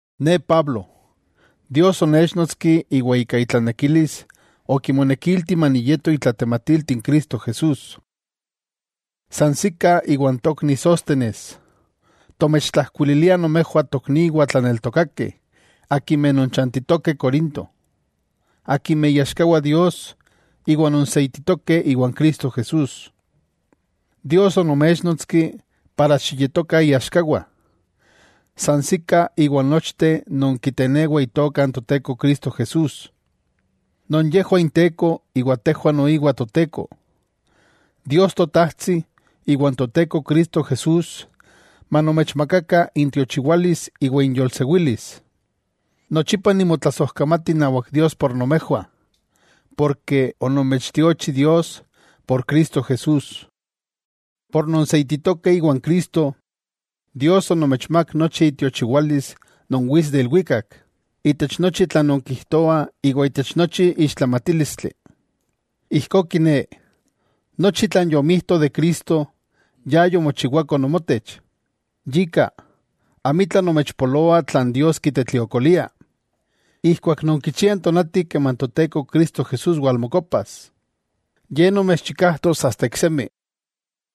Ne Pablo, Dios onechnotski iwa ika itlanekilis okimonekilti maniyeto itlatematilti n Cristo Jesús, san sika iwa n tokni Sóstenes, tomechtlajkuililiah nomejwah tokniwah tlaneltokakeh akimeh nonchantitokeh Corinto, akimeh iaxkawah Dios iwa nonseititokeh iwan Cristo Jesús. Dios onoméchnotski xiyetokah iaxkawah, san sika iwan nochteh non kitenewa Itoka n Toteko Cristo Jesús, non yejwah Inteko iwa tejwah noiwa Toteko. Dios Totajtsi iwa n Toteko Cristo Jesús manomechmakakah intiochiwalis iwa inyolsewilis. Nochipa nimotlasojkamati inawak Dios por nomejwah, ken onomechtiochi por Cristo Jesús. Por nonseititokeh iwa n Cristo, Dios onomechmák nochi itiochiwalis non wits de ilwikak, itech nochi tlan nonkijtoah iwa itech nochi ixtlamatílistli. Ijkó kiné, nochi tlan yomijto de Cristo, ya yomochiwako nomotech. Yika, amitla nomechpoloa tlan Dios kitetliokolia, ijkuak nonkichiah n tonati keman Toteko Cristo Jesús walmokopas. Ye nomechchikajtos asta iksemi,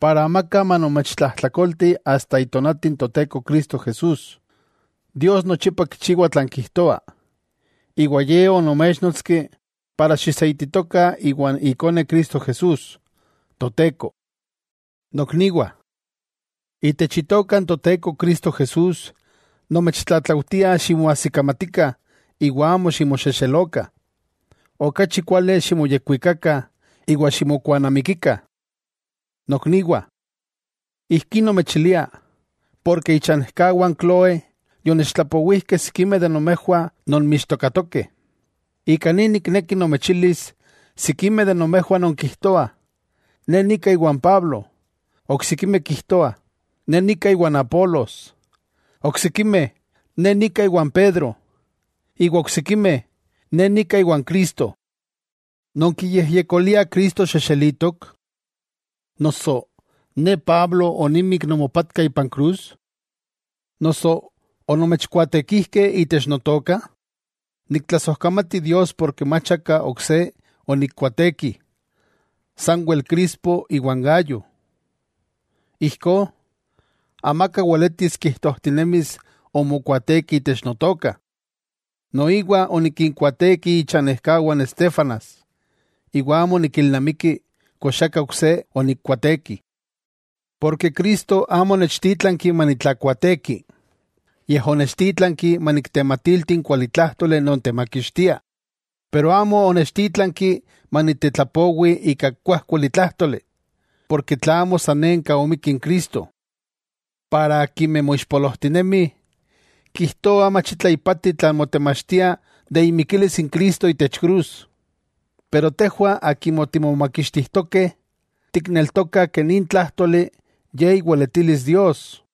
para amaka manomechtlajtlakolti asta itonati n Toteko Cristo Jesús. Dios nochipa kichiwa tlan kijtoa, iwa Ye onoméchnotski para xiseititokah iwan Ikone Cristo Jesús, Toteko. Nokniwah, itech Itoka n Toteko Cristo Jesús, nomechtlatlaujtia ximoajsikamatikah iwa amo ximoxexelokah. Okachi kuali ximoyekwikakah iwa ximokuanamikikah. Nokniwah, ijkí nomechilia, porke ichanejkawah n Cloé yonechtlapowijkeh sikimeh de nomejwah nonmixtokatokeh. Ika ni nikneki nomechilis sikimeh de nomejwah nonkijtoah: “Ne nika iwan Pablo”. Oksikimeh kijtoah: “Ne nika iwan Apolos”. Oksikimeh “Ne nika iwan Pedro”. Iwa oksikimeh: “Ne nika iwan Cristo.” ¿Nonkiyejyekoliah Cristo xexelitok? Noso ¿ne Pablo onimik nomopatka ipan krus? ¿Noso onomechkuaatekijkeh itech notoka? Niktlasojkamati Dios porke mach aka ok se onikkuaateki, sanwel Crispo iwa n Gayo; ijkó, amaka weletis kijtojtinemis omokuaateki itech notoka. Noiwa onikinkuaateki ichanejkawah n Estéfanas, iwa amo nikilnamiki kox aka ok se onikkuaateki. Porke Cristo amo onechtítlanki manitlakuaateki, yej onechtítlanki maniktematilti n kualitlájtoli non temakixtia, pero amo onechtítlanki manitetlapowi ika kuájkuali tlájtoli, porke tlamo sanenka omikki n Cristo. Para akimeh moixpolojtinemih, kijtoah mach itla ipati tlan motemachtia de imikilis n Cristo itech krus. Pero tejwah akimeh timomakixtijtokeh, tikneltokah nin tlájtoli ye iweletilis Dios.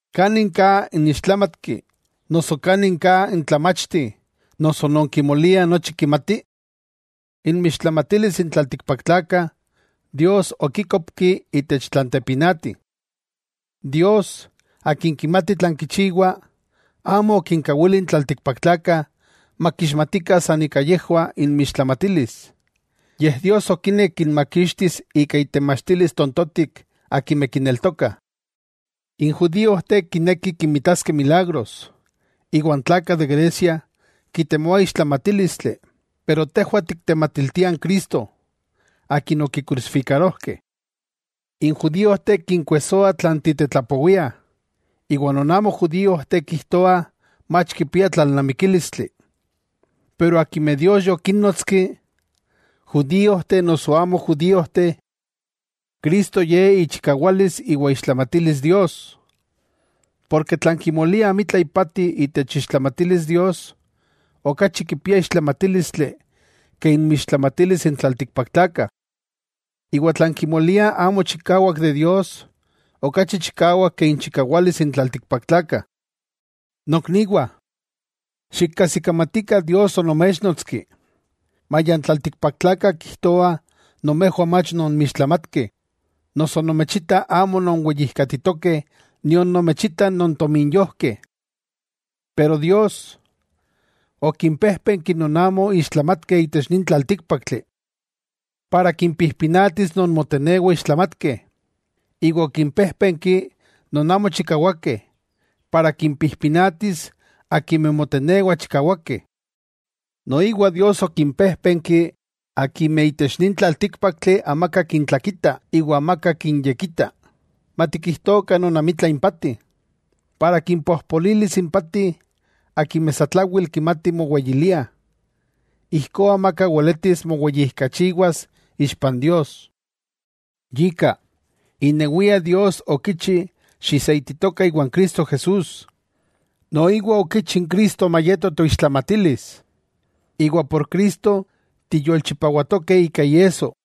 ¿Kanin ka n ixtlámatki noso kanin ka n tlamachti noso non kimolia nochi kimati? Inmixtlamátilis n tlaltikpaktlakah, Dios okíkopki itech tlan tepinati. Dios, Akin kimati tlan kichiwa, amo okinkawili n tlaltikpaktlakah makixmatikah san ika yejwah inmixtlamatilis, yej Dios okinek kinmakixtis ika itemachtilis “tontotik” akimeh kineltokah. N judíojteh kinekih kinmitaskeh milagros, iwa n tlakah de Grecia kitemoah ixtlamachtílistli, pero tejwah tiktematiltiah n Cristo, Akin okikrusifikarojkeh. N judíojteh kinkuejsoa tlan titetlapowiah, iwa non amo judíojteh kijtoah mach kipia tlalnamikílistli. Pero akimeh Dios yokínnotski, judíojteh noso amo judíojteh, Cristo ye ichikawalis iwa iixtlamatilis Dios. Porke tlan kimoliah amitla ipati itech iixtlamatilis Dios, okachi kipia ixtlamatílistli ke inmixtlamatilis n tlaltikpaktlakah. Iwa tlan kimoliah amo chikawak de Dios, okachi chikawak ke inchikawalis n tlaltikpaktlakah. Nokniwah, xikajsikamatikah Dios onoméchnotski, maya n tlaltikpaktlakah kijtoah nomejwah mach nonmixtlamatkeh, noso nomechitah amo nonweyijkatitokeh nion nomechitah nontominyojkeh. Pero Dios, okimpéjpenki non amo ixtlamatkeh itech nin tlaltíkpaktli, para kimpijpinatis non motenewah ixtlamatkeh, iwa okimpéjpenki non amo chikawakeh, para kimpijpinatis akimeh motenewah chikawakeh. Noiwa Dios okimpéjpenki akimeh itech nin tlaltíkpaktli amaka kintlakitah iwa amaka kinyekita, matikijtokah non amitla impati, para kimpojpolilis impati akimeh satlawel kimatih moweyiliah. Ijkó amaka weletis moweyijkachiwas ixpa n Dios. Yika, inewia Dios okichi xiseititokah iwan Cristo Jesús, noiwa okichi n Cristo mayeto toixtlamatilis, iwa por Cristo tiyolchipawatokeh ika iesso.